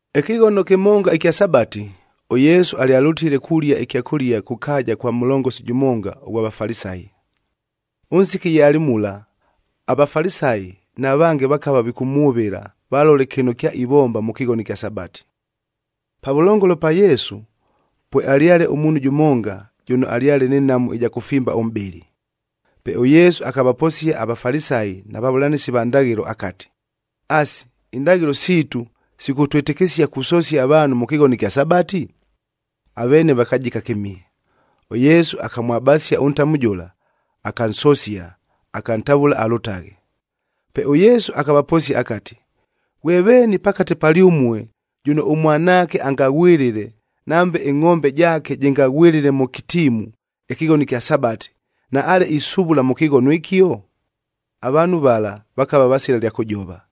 Ɨkɨghono kɨmonga ɨkya Sabati, ʉYesu alyalʉtile kulia ɨkyakʉlia kʉ kaaja kwa mʉlongosi jʉmonga ʉghwa Vafalisayi. Ʉnsiki ye alɨ mula, aVafalisayi na vange vakava vikʉmwʉvɨla valole kɨno kyaivomba mʉ kɨghono ɨkya Sabati. Pavʉlongolo pa Yesu, pwealyale ʉmuunhu jʉmonga, jʉno alyale nɨ nhamu ɨja kʉfimba ʉmʼbɨlɨ. Pe ʉYesu akavaposia aVafalisayi na vavʉlanɨsi va ndaghɨlo akati, “Asi, indaghɨlo siitu sikʉtwɨtɨkɨsia kusosia avaanhu mʉ kɨghono ɨkya Sabati?” Aveene vakajika kɨmihe. ɄYesu akamwabasia ʉntamu jʉla, akansosia, akantavʉla alʉtaghe. Pe ʉYesu akavaposia akati, “Ghwe veeni pakate palyʉmue jʉno ʉmwanaake angaghwɨlɨle, nambe ɨngʼombe jaake jɨngaghwɨlɨle mʉ kɨtiimu ɨkɨghono ɨkya Sabati, naale isuvula mʉ kɨghono ɨkio?” Avaanhu vala, vakava vasila ɨlya kʉjova.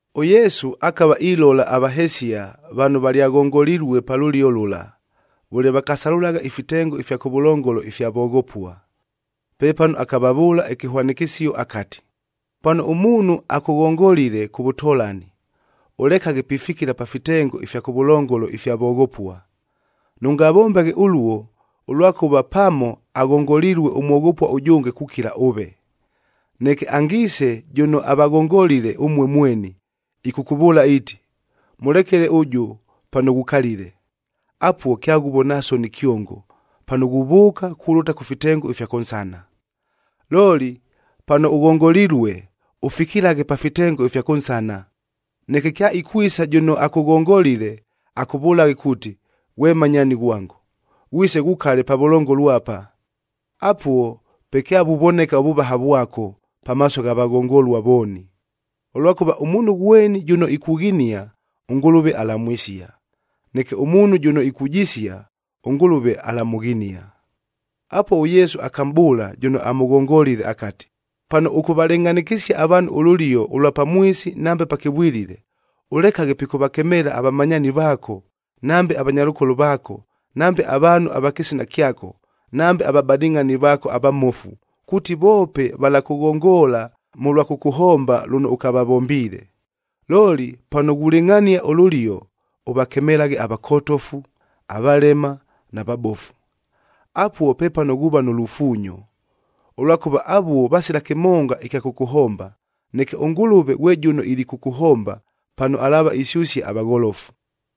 ɄYesu akava ilola avahesia vano valyaghongolilue pa lʉlio lʉla, vʉle vakasalʉlagha ifitengo ifya kʉvʉlongolo ifya voghopua. Pepano akavavʉʉla ɨkɨhwanɨkɨsio akati, “Pano ʉmuunhu akʉghongolile kʉ vʉtolani, ʉlekaghe pifikila pa fitengo ifya kʉvʉlongolo ifya voghopua. Nʉngavombaghe ʉluo, ʉlwakʉva pamo aghongolilue ʉmwoghopua ʉjʉnge kukila ʉve. Neke angiise jʉno avaghongolile ʉmue mweni, ɨkʉkʉvʉʉla iiti, ‘Mʉlekele ʉjʉ pano ghukalile.’ Apuo, kyaghuvona soni kyongo, pano ghuvʉʉka kulʉta kʉ fitengo ifya kʉnsana. “Looli, pano ʉghongolilue, ʉfikilaghe pa fitengo ifya kʉnsana, neke kyaikwisa jʉno akʉghongolile, akʉvʉlaghe kuuti, ‘Ghwe mmanyaani ghwango, ghwise ghukale pavʉlongolo apa.’ Apuo pe kyavuvoneka ʉvʉvaha vwako, pamaaso gha vaghongolua vooni. Ʉlwakʉva, ʉmuunhu ghweni jʉno ikughinia, ʉNgʉlʉve alamwisia. Neke ʉmuunhu jʉno ikujisia, ʉNgʉlʉve alamʉghinia.” Apuo, ʉYesu akamʼbʉʉla jʉno amʉghongolile akati, “Pano ʉkʉvalɨngʼhanɨkɨsia avaanhu ʉlʉlio ʉlwa pamwisi nambe pakɨvwilile, ʉlekaghe pikʉvakemeela avamanyaani vaako, nambe avanyalʉkolo vaako, nambe avaanhu ava kɨsina kyako, nambe avabadɨngʼhani vaako avamofu, kuuti voope valakʉghongoola mʉlwa kʉkʉhomba lʉno ʉkavavombiile. Looli, pano ghulɨngʼhania ʉlʉlio, ʉvakemelaghe avakotofu, avalema, na vabofu. Apuo pepano ghuuva nʉ lufuunyo, ʉlwakʉva avuo vasila kɨmonga ɨkya kʉkʉhomba. Neke ʉNgʉlʉve ghwe jʉno ilikʉkʉhomba, pano alaava isyʉsia avagholofu.”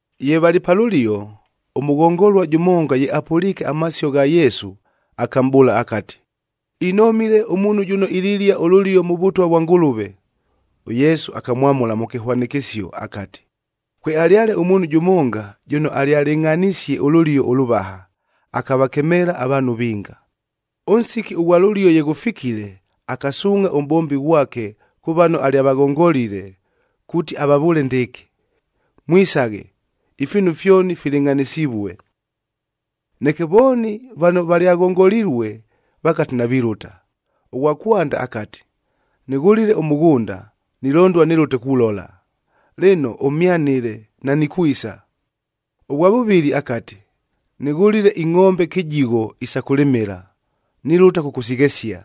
Ye valɨ pa lʉlio, ʉmʉghongolua jʉmonga ye apʉliike amasio gha Yesu, akamʼbʉʉla akati, “Inomile, ʉmuunhu jʉno ililia ʉlʉlio mʉ Vʉtwa vwa Ngʉlʉve!” ɄYesu akamwamʉla mʉ kɨhwanɨkɨsio akati, “Kwealyale ʉmuunhu jʉmonga, jʉno alyalɨngʼhanisie ʉlʉlio ʉlʉvaha, akavakemeela avaanhu vinga. Ʉnsiki ʉghwa lʉlio ye ghʉfikile, akasuungʼha ʉmʼbombi ghwake kʉ vano alyavaghongolile, kuuti avavʉʉle ndɨɨkɨ, ‘Mwisaghe! Ifiinu fyoni filɨngʼhanɨsivue!’ “Neke vooni vano valyaghongolilue vakati navilʉta. Ʉghwa kwanda akati, ‘Nɨghʉlile ʉmʉghʉnda, nilondua nɨlʉte kulola. Lɨno ʉmhyanɨle, nanikwisa.’ Ʉghwa vʉvɨlɨ akati, ‘Nɨghʉlile ingʼombe kɨjigho isa kʉlɨmɨla, nilʉta kʉkʉsighesia.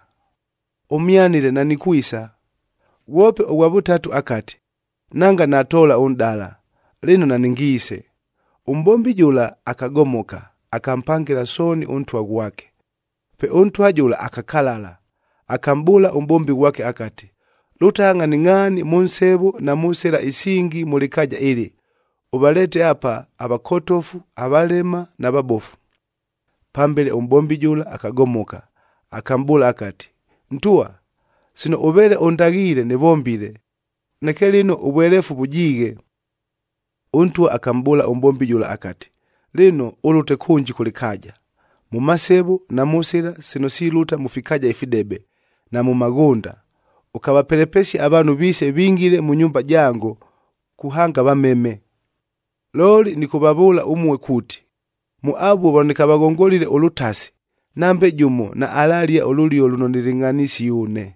Ʉmhyanɨle nanikwisa.’ Ghwope ʉghwa vʉtatu akati, ‘Nanga natoola ʉnʼdala, lɨno nanɨngiise.’ “Ʉmʼbombi jʉla akagomoka, akampangɨla sooni ʉntwa ghwake. Pe ʉntwa jʉla akakalala, akamʼbʉʉla ʉmʼbombi ghwake akati, ‘Lʉtagha ngʼhaningʼhaani mʉ nsevo na mʉ sɨla isingi mʉ lɨkaaja ɨlɨ, ʉvaleete apa avakotofu, avalema na vabofu.’ “Pambele, ʉmʼbombi jʉla akagomoka, akamʼbʉʉla akati, ‘Ntwa, sino ʉveele ʉndaghiile nɨvombile. Neke lɨno, ʉvweleefu vʉjiighe.’ “Ʉntwa akamʼbʉʉla ʉmʼbombi jʉla akati, ‘Lɨno, ʉlʉte kʉnji kʉ lɨkaaja, mʉ masevo na mʉ sɨla sino silʉta mʉ fikaaja ifidebe, na mʉ maghʉnda, ʉkavapelepesie avaanhu viise vingile mʉ nyumba jango, kuhanga vameme. Looli, nɨkʉvavʉʉla ʉmue kuuti, mʉ avuo vano nɨkavaghongolile ʉlʉtasi, nambe jʉmo naalalia ʉlʉlio lʉno nɨlɨngʼhanisie ʉne!’”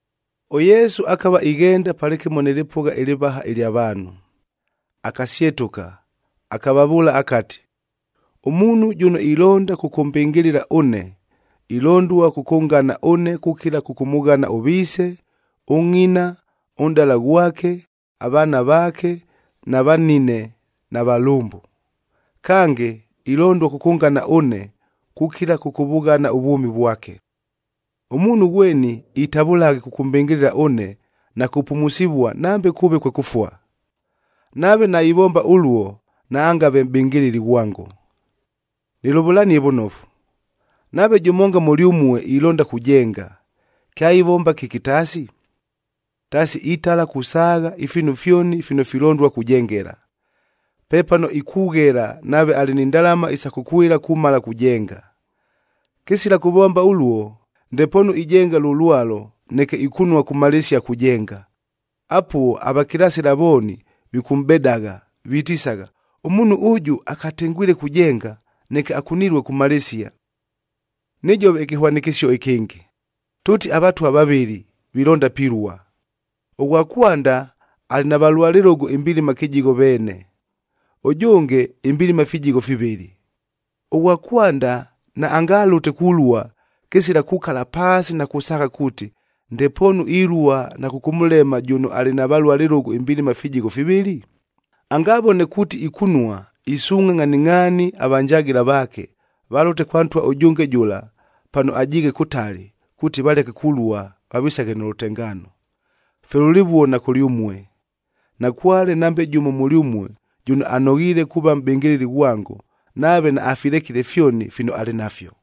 ɄYesu akava ighenda palɨkɨmo nɨ lɨpʉgha ɨlɨvaha ɨlya vaanhu. Akasyetʉka, akavavʉʉla akati, “Ʉmuunhu jʉno ilonda kʉkʉmbɨngɨlɨla ʉne, ilondua kʉkʉngana ʉne kukila kʉkʉmʉghana ʉviise, ʉngʼina, ʉnʼdala ghwake, avaana vaake, na vanine na valʉmbʉ. Kange, ilondua kʉkʉngana ʉne kukila kʉkʉvʉghana ʉvwʉmi vwake. Ʉmuunhu ghweni itavʉlaghe kʉkʉmbɨngɨlɨla ʉne na kupumusivua, nambe kʉʉve kwe kʉfua. Nave naivomba ʉluo, naangave mʼbɨngɨlɨli ghwango. “Nɨlʉvʉlanie vʉnofu, nave jʉmonga mʉlyʉmue ilonda kujenga, kyaivomba kɨki taasi? Taasi, itala kusaagha ifiinu fyoni fino filondua kujengela. Pepano ikughela nave alɨ ni ndalama isa kʉkwɨla kumala kujenga. Kɨsila kʉvomba ʉluo, ndepoonu ijenga lʉ lwalo, neke ikunua kumalɨsia kujenga. Apuo avakilasɨla vooni vikʉmʼbedagha, vitisagha, ‘Ʉmuunhu ʉjʉ akatengwile kujenga, neke akunilue kumalɨsia!’ “Nɨjove ɨkɨhwanɨkɨsio ɨkɨngɨ, tʉʉti avatwa vavɨlɨ vilonda pilua. Ʉghwa kwanda alɨ na valua lɨlʉgʉ imbilima kɨjigho veene, ʉjʉnge imbilima fijigho fivɨlɨ. Ʉghwa kwanda naangalʉte kulua, kɨsila kukala paasi na kusaagha kuuti, ndepoonu ilua na kʉkʉmʉlema, jʉno alɨ na valua lɨlʉgʉ imbilima fijigho fivɨlɨ? Angavone kuuti ikunua, isuungʼha ngʼhaningʼhaani avanjagɨla vaake, valʉte kwa ntwa ʉjʉnge jʉla pano ajiighe kʉtali, kuuti valeke kulua vavisaghe nʉ lʉtengaano. “Fye lʉlɨvuo na kʉlyʉmue, nakwale nambe jʉmo mʉlyʉmue jʉno anoghiile kuuva mʼbɨngɨlɨli ghwango, nave naafilekile fyoni fino alɨ nafyo.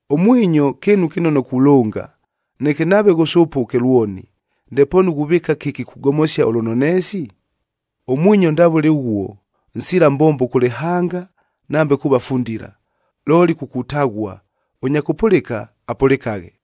“Ʉmwinyo kɨɨnu kɨnono kulʉnga. Neke nave ghʉsʉpʉke lwoni, ndepoonu ghuvɨɨka kɨki kugomosia ʉlʉnoneesi? Ʉmwinyo ndavʉle ʉghuo, nsila mbombo kʉ lɨhanga, nambe kuuva fundila, looli ku kutaghua. Ʉnya kʉpʉlɨka, apʉlɨkaghe!”